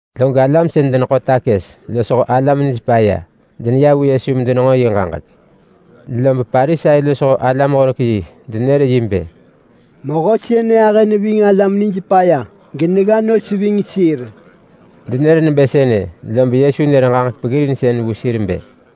Log alam sën deneḳo takës losho alam nij paya deneya vu Yesu medenenġo yi ġaġek. Lob Parisai losho alam-horek-yi denër yi bë, “Mehö sënë ahë neving alam nijpaya, genegga nos ving sir.” Denër nebë sënë, lob Yesu nër ġaġek peggirinsën vu sir bë,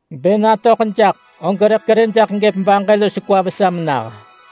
Bë natöḳ jaḳ, og rëḳ kerë jaḳ gëp baġë los kwa vesa menah.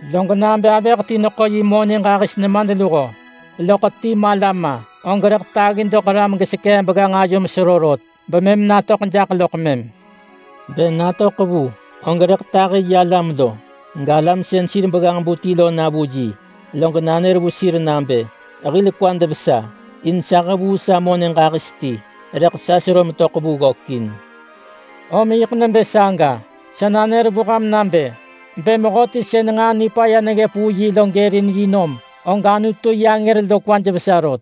“Log nabë avëh ti neḳo yi monë ġahis nemadluho, loḳ ti mala ma, og rëḳ taggi doḳ ram gesekee begganġ ayo menesero rot, bemëm natöḳ jaḳ loḳ mëm. Bë natöḳ vu, og rëḳ tahi yi alam lo, galam sën sir begganġ-bu ti lo na vu yi, log nanër vu sir nabë, ‘Hil kwad vesa! In sa hevuu sa monë ġahis ti, rëḳ sa sero metöḳ vu ggökin.’ Om yiḳ nebë saga, sa nanër vu ham nabë: Bë mehöti sën nġaa nipaya neggëp vu yi lo gërin yi nom, og Anutu yi angër lo kwaj vesa rot.”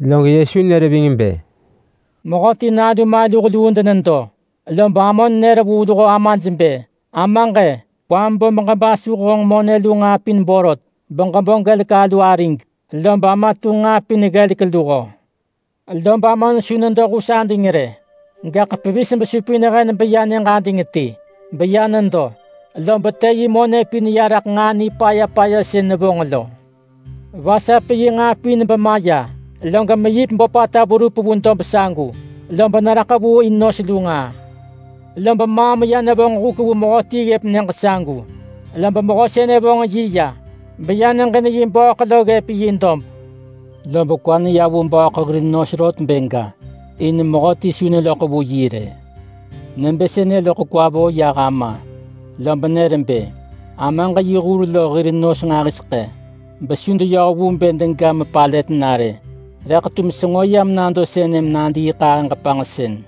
Log Yesu nër ving bë, “Mehöti nalu maluh luu denedo, lob amon nër vu luho amaj bë, ‘Amaġ-e, kwam bo beġebasuh honġ monë lu nġaa pin borot, beġebo gelek alu arig.’ Lob ama tunġ nġaa pin ggelek luho. Lob amon su nedo hus ading rë, gaḳ pevis besupin hen beya nyëġ ading ti. Beya nedo, lob të yi monë pin ya raḳ nġaa nipaya paya sën nevonġ lo. Vasap yi nġaa pin bemaya, log meyip böpata verup vu dob sagu. Lob neraḳ vu in nos lu nġaa. Lob maam ya nevonġ huk vu mehöti ggëp nyëġ sagu. Lob mehö sënë vonġ yi ya, beya neġin yi bööḳ lo ggëp yi dob. Lob kwa neya vu bööḳ hir nos rot bë ga, in mehöti su neloḳ vu yi rë. Nebë sënë loḳ kwa yah töḳ raḳ ama, lob nër bë, ‘Amaġ yi hur lo hir nos nġahiseḳë, besu deyoh vu bë dega mepalët na rë. Rëḳ tum senġo yam nado sënë menadiiḳahëġ panġsën.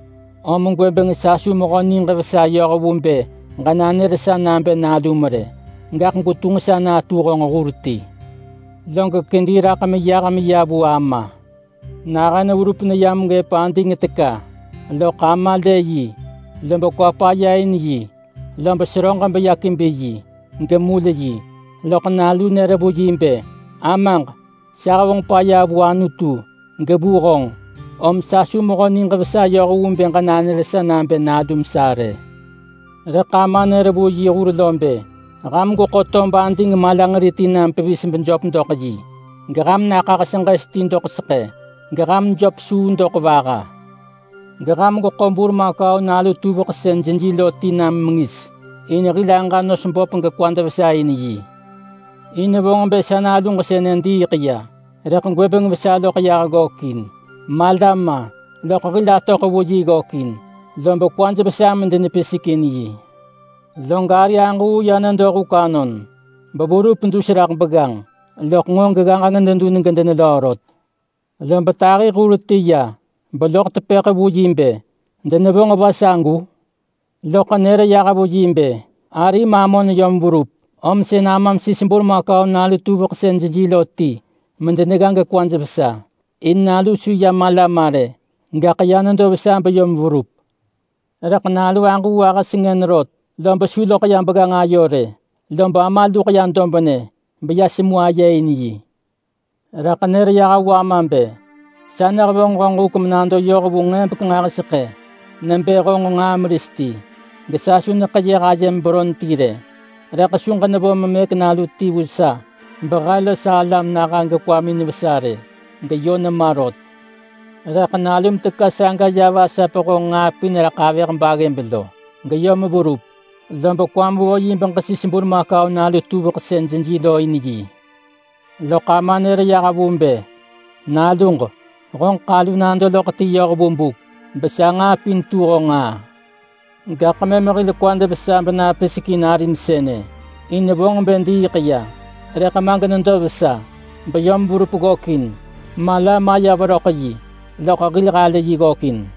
Om gwëbeng sa su mehö niġ vesa yoh vu bë ġenanër sa nabë nalum rë. Gaḳ gwetunġ sa natu honġ hur ti.” ’ Log kedi raḳ meyah meya vu ama. Nahën verup neyam ggëp ading teka, loḳ ama lë yi, lob kwa paya in yi. Lob seröġ beya kebi yi, gemul yi. Loḳ nalu nër vu yi bë, ‘Amaġ, sa hevonġ paya vu Anutu, gevu honġ. Om sa su mehö niġ vesa yoh vu bë ġenanër sa nabë nalum sa rë.’ Rëḳ ama nër vu yi hur lo bë, ‘Ham gweḳo tob ading malanġeri ti nam pevis bejöp doḳ yi. Geham naḳah seġes ti doḳ seḳë. Geham jöp suu doḳ vaha. Geham gweḳo burmakau nalu tuveḳ sën jeji lo ti nam mengis, in hil aġa nos böp gekwad vesa in yi. In vonġ bë sa naluġ sënë diiḳ ya, rëḳ gwëbeng vesa loḳ yah ggökin. Mala ma, loḳ hil atöḳ vu yi ggökin.’ Lob kwaj vesa medenepisek in yi lo. Log ari aġuu ya nedo huk anon, beverup dus raḳ begganġ, loḳ nġo geggaġeng dedun gedenelöö rot. Lob tahi hur ti ya, beloḳ tepëḳ vu yi bë, ‘Denevonġ va sagu?’ Loḳ nër yah vu yi bë, ‘Arim amon yom verup, om sën amam sis burmakau nalu tuveḳ sën jeji lo ti medenegga gekwaj vesa. In nalu su ya mala ma rë, gaḳ ya nedo vesa beyom verup.’ Rëḳ nalu aġuu ahë sengën rot, lob su loḳ ya begganġ ayo rë. Lob ama luḳ ya dobnë, beya semu aye in yi. Rëḳ nër yah vu ama bë, ‘Sa nehevonġ honġ huk menado yoh vu nġebek nġahiseḳë nebë honġ nġaa meris ti, gesa su neḳeyëh ayem beron ti rë. Rëḳ su ġenevo memëk nalu ti vu sa, behe los sa alam naha gekwamin vesa rë. Geyö nema rot. Rëḳ nalum teka saga ya vasap honġ nġaa pin raḳ avëh baggëb lo, geyom verup, lob kwam vo yi beġesis burmakau nalu tuveḳ sën jeji lo in yi.’ Loḳ ama nër yah vu bë, ‘Naluġ, honġeḳ alu nado loḳ ti yoh vu buk, besa nġaa pin tu honġ nġaa. Gaḳ mëm hil kwad vesa benapisek in arim sënë. In vonġ bë diiḳ ya, rëḳ ma genedo vesa beyom verup ggökin. Mala maya veröḳ yi, loḳ hil halë yi ggökin.’”